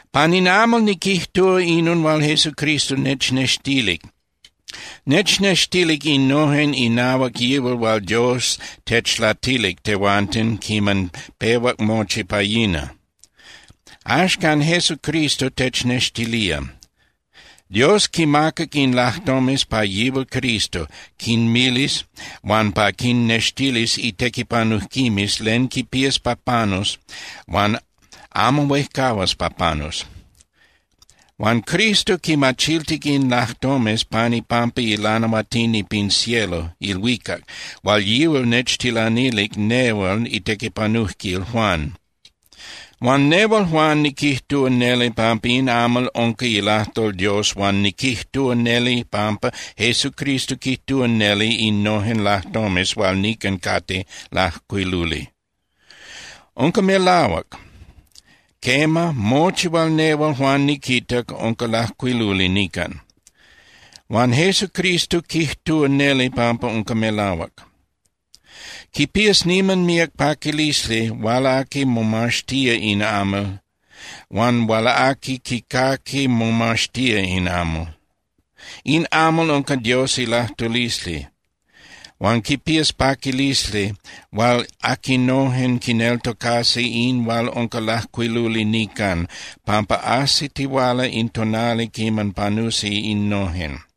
Pan in amal niquijtúa inon hual Jesucristo nechnextilic. Nechnextilic innojen inahuac yihual hual Dios techlatilic tehuanten quiman pehuac mochi pa yina. Axcan Jesucristo technextilía. Dios quimacac in lajtomes pa yihual Cristo quinmilis huan pa quinnextilis itequipanujquimes len quipías pa panus huan amo huejcahuas pa panus. Huan Cristo quimachiltic in lajtomes pan ipampa ilanahuatini pin cielo (ilhuicac) hual yihual nechtilanilic nehual itequipanujquil Juan. Huan nehual Juan niquijtúa neli pampa in amal unca ilajtol Dios huan niquijtúa neli pampa Jesucristo quijtúa neli innojen lajtomes hual nican cate lajcuiluli. Unca melahuac. Quema, mochi hual nehual Juan niquitac unca lajcuiluli nican. Huan Jesucristo quijtúa neli pampa unca melahuac. Quipías niman míac paquilisli hual aqui momaxtía in amal huan hual aqui quicaqui momaxtía in amal. In amal unca Dios ilajtulisli, huan quipías paquilisli hual aquinojen quineltocasi in hual unca lajcuiluli nican, pampa ajsitihuala in tonali quiman panusi innojen.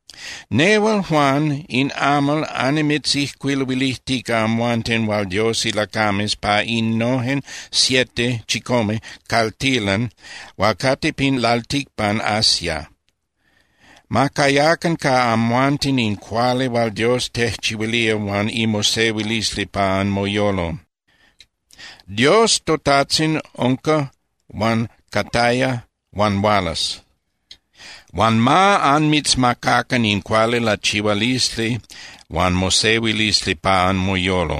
Nehual, Juan, in amal annimitzijcuiluilijtica amhuanten hual Dios ilacames pa innojen siete (chicome) caltilan hual cate pin lalticpan Asia. Ma cayacan ca amhuanten in cuali hual Dios tejchihuilía huan imosehuilisli pa anmoyolo. Dios toTajtzin unca huan cataya huan hualas. Huan ma anmitzmacacan in cuali lachihualisli huan mosehuilisli pa anmoyolo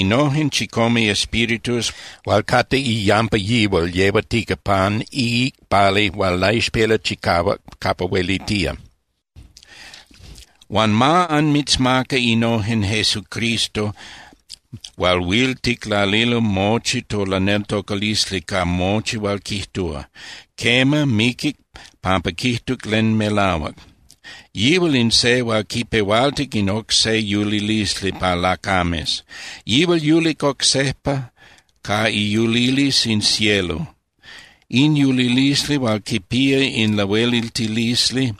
innojen chicome Espíritus hual cate iyampa yihual yehuatica pan iicpali hual laixpela chicahuac capa huelitía. Huan ma anmitzmaca innojen Jesucristo hual huil ticlalilo mochi tolaneltocalisli ca mochi hual quijtúa. Quema, miquic pampa quijtuc len melahuac. Yihual in se hual quipehualtic in oc se yulilisli pa lacames. Yihual yulic oc sejpa ca iyulilisli in cielo, in yulilisli hual quipía in lahueliltilisli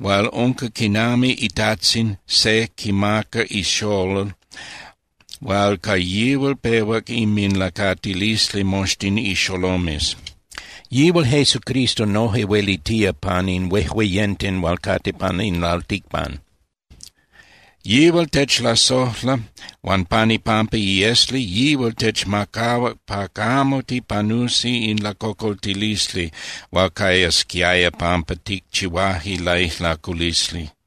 hual unca quinami itajtzin se quimaca ixolol hual ca yihual pehuac inminlacatilisli moxtin ixolomes. Yihual Jesucristo noje huelitía pan in huejueyenten hual cate pan in lalticpan. Yihual techlasojla huan pan ipampa iesli yihual techmacahuac pa camo tipanusi in lacocoltilisli hual cayasquiaya pampa ticchihuaje laijlaculisli.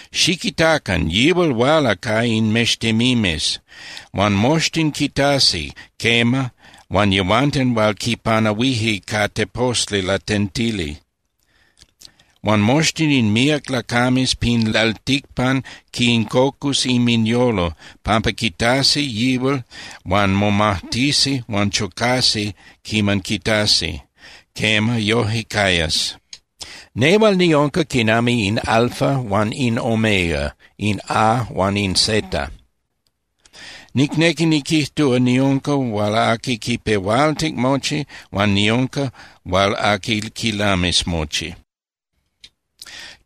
¡Xiquitacan, yihual huala ca in mextemimes! Huan moxtin quitasi, quema, huan yehuanten hual quipanahuije ca teposli latentili. Huan moxtin in míac lacames pin lalticpan, quincocus inminyolo pampa quitasi yihual huan momajtisi huan chocasi quiman quitasi. Quema, yoje cayas. “Nehual niunca quinami in Alfa huan in Omega, in A huan in Z. Nicnequi niquijtúa, niunca hual aqui quipehualtic mochi, huan niunca hual aqui quilamis mochi”,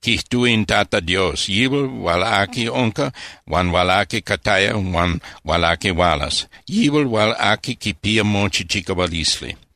quijtúa in Tata Dios, yihual hual aqui unca huan hual aqui cataya huan hual aqui hualas, yihual hual aqui quipía mochi chicahualisli.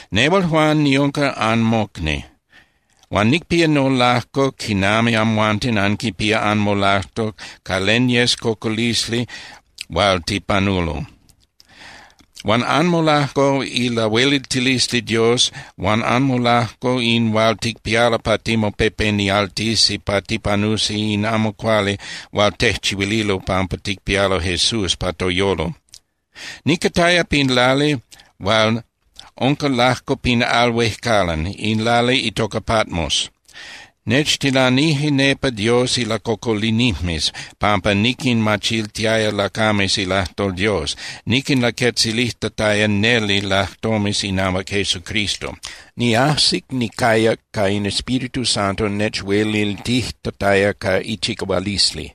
Nehual, Juan, niunca anmocni, huan nicpía nolajco quinami amhuanten anquipia anmolajco ca len yes cocolisli hual tipanulo, huan anmolajco ilahueliltilisli Dios huan anmolajco in hual ticpialo pa timopepenialtisi pa tipanusi in amo cuali hual tejchihuililo pampa ticpialo Jesús pa toyolo. Nicataya pin lali hual unca lajco pin al huejcalan, in lali itoca Patmos. Nechtilanije nepa Dios ilacocolinijmes pampa niquinmachiltiaya lacames ilajtol Dios, niquinlaquetzilijtataya neli lajtomes inahuac Jesucristo. Niajsic nicayac ca in Espíritu Santo nechueliltijtataya ca ichicahualisli.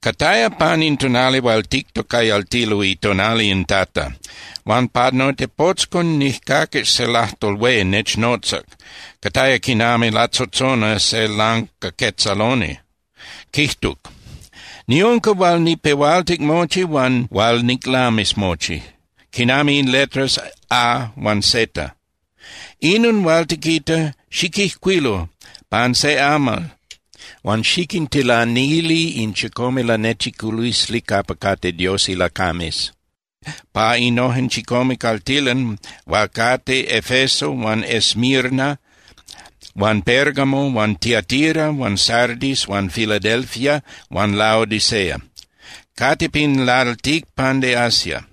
Cataya pan in tonali hual tictocayaltilo itonali in Tata. Huan pa notepotzcon nijcaquic se lajtol hué nechnotzac, cataya quinami latzotzona se lancaquetzaloni. Quijtuc: —Niunca hual nicpehualtic mochi huan hual niclamis mochi, quinami in letras A huan Z. Inon hual tiquita, xiquijcuilu pan se amal huan xiquintilanili in chicome lanechiculisli capa cate Dios ilacames pa innojen chicome caltilan hual cate Efeso huan Esmirna huan Pérgamo huan Tiatira huan Sardis huan Filadelfia huan Laodicea. Cate pin lalticpan de Asia.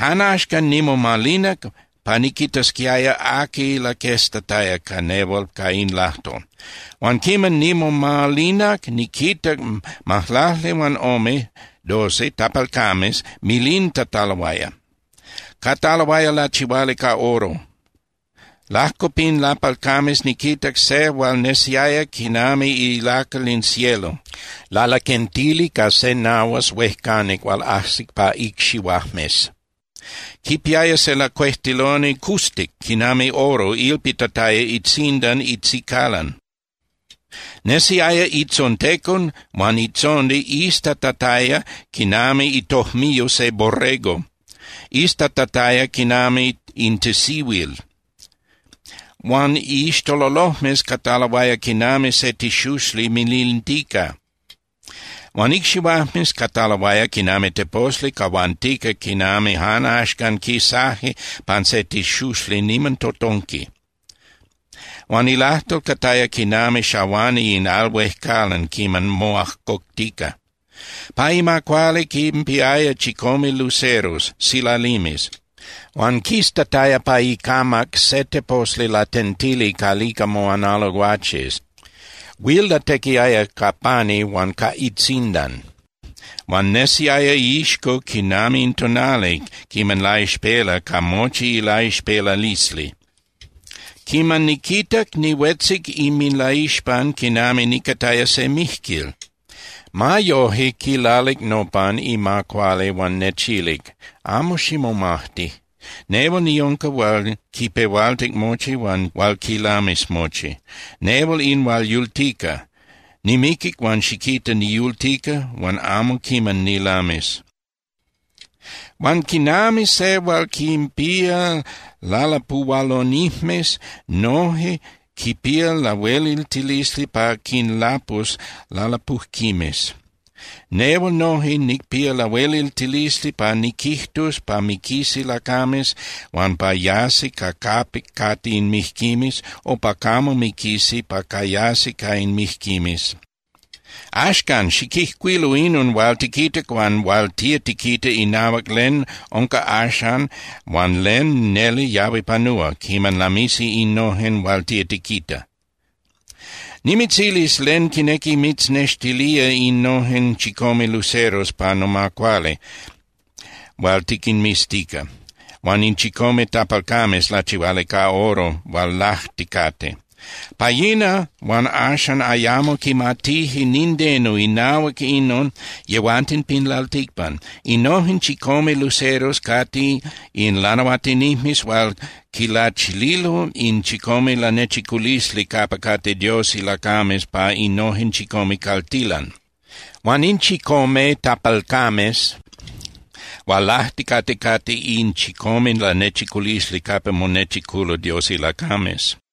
Jan axcan nimomalinac pa niquitasquiaya aqui laqueztataya ca nehual ca in lajtol. Huan quiman nimomalinac, niquinmitac majlaclihuanome (doce) tapalcames milintataloaya. Cataloaya lachihuali ca oro. Lajco pin tapalcames niquitac se hual nesiaya quinami ilacal in cielo, lalaquentili ca se nahuas huejcanic hual ajsic pa icxihuajmes. Quipiaya se lacuejtiloni custic quinami oro ilpitataya itzindan itzicalan. Nesiaya itzontecon huan itzondi iztatataya quinami itojmiyo de borrego, iztatataya quinami in tisihuil. Huan iixtololojmes cataloaya quinami se tixuxli milintica. Huan icxihuajmes cataloaya quinami teposli cahuantica quinami jan axcan quisaje pan se tixuxli niman totonqui. Huan ilajtol cataya quinami xahuani in al huejcalan quiman moajcoctica. Pa ima cuali quinpiaya chicome luceros (silalimes), huan quistataya pa icamac se teposli latentili calica moanalo guaches. Huil latequiaya ca pani huan ca itzindan. Huan nesiaya iixco quinami in tonali quiman laixpela ca mochi ilaixpelalisli. Quiman niquitac, nihuetzic inminlaixpan quinami nicataya se mijquil. Ma yoje, quilalic nopan ima cuali huan nechilic: —Amo ximomajti. Nehual niunca hual quipehualtic mochi huan hual quilamis mochi. Nehual in hual yultica. Nimiquic huan xiquita, niyultica huan amo quiman nilamis. Huan quinami se hual quinpía lalapuhualonijmes noje quipía lahueliltilisli pa quinlapus lalapujquimes, nehual noje nicpía lahueliltilisli pa niquijtus pa miquisi lacames huan pa yasi ca capic cate in mijquimes o pa camo miquisi pa cayasi ca in mijquimes. Axcan, xiquijcuilu inon hual tiquitac huan hual tía tiquita inahuac len unca axan huan len neli yahui panúa quiman lamisi innojen hual tía tiquita. Nimitzilis len quinequi mitznextilía innojen chicome luceros pa noma cuali hual tiquinmiztica, huan in chicome tapalcames lachihuali ca oro hual lajticate. Pa yina huan axan ayamo quimatije nindeno inahuac inon yehuanten pin lalticpan. Innojen chicome luceros cate in lanahuatinijmes hual quilachililo in chicome lanechiculisli capa cate Dios ilacames pa innojen chicome caltilan. Huan in chicome tapalcames hual lajticate cate in chicome lanechiculisli capa monechiculo Dios ilacames.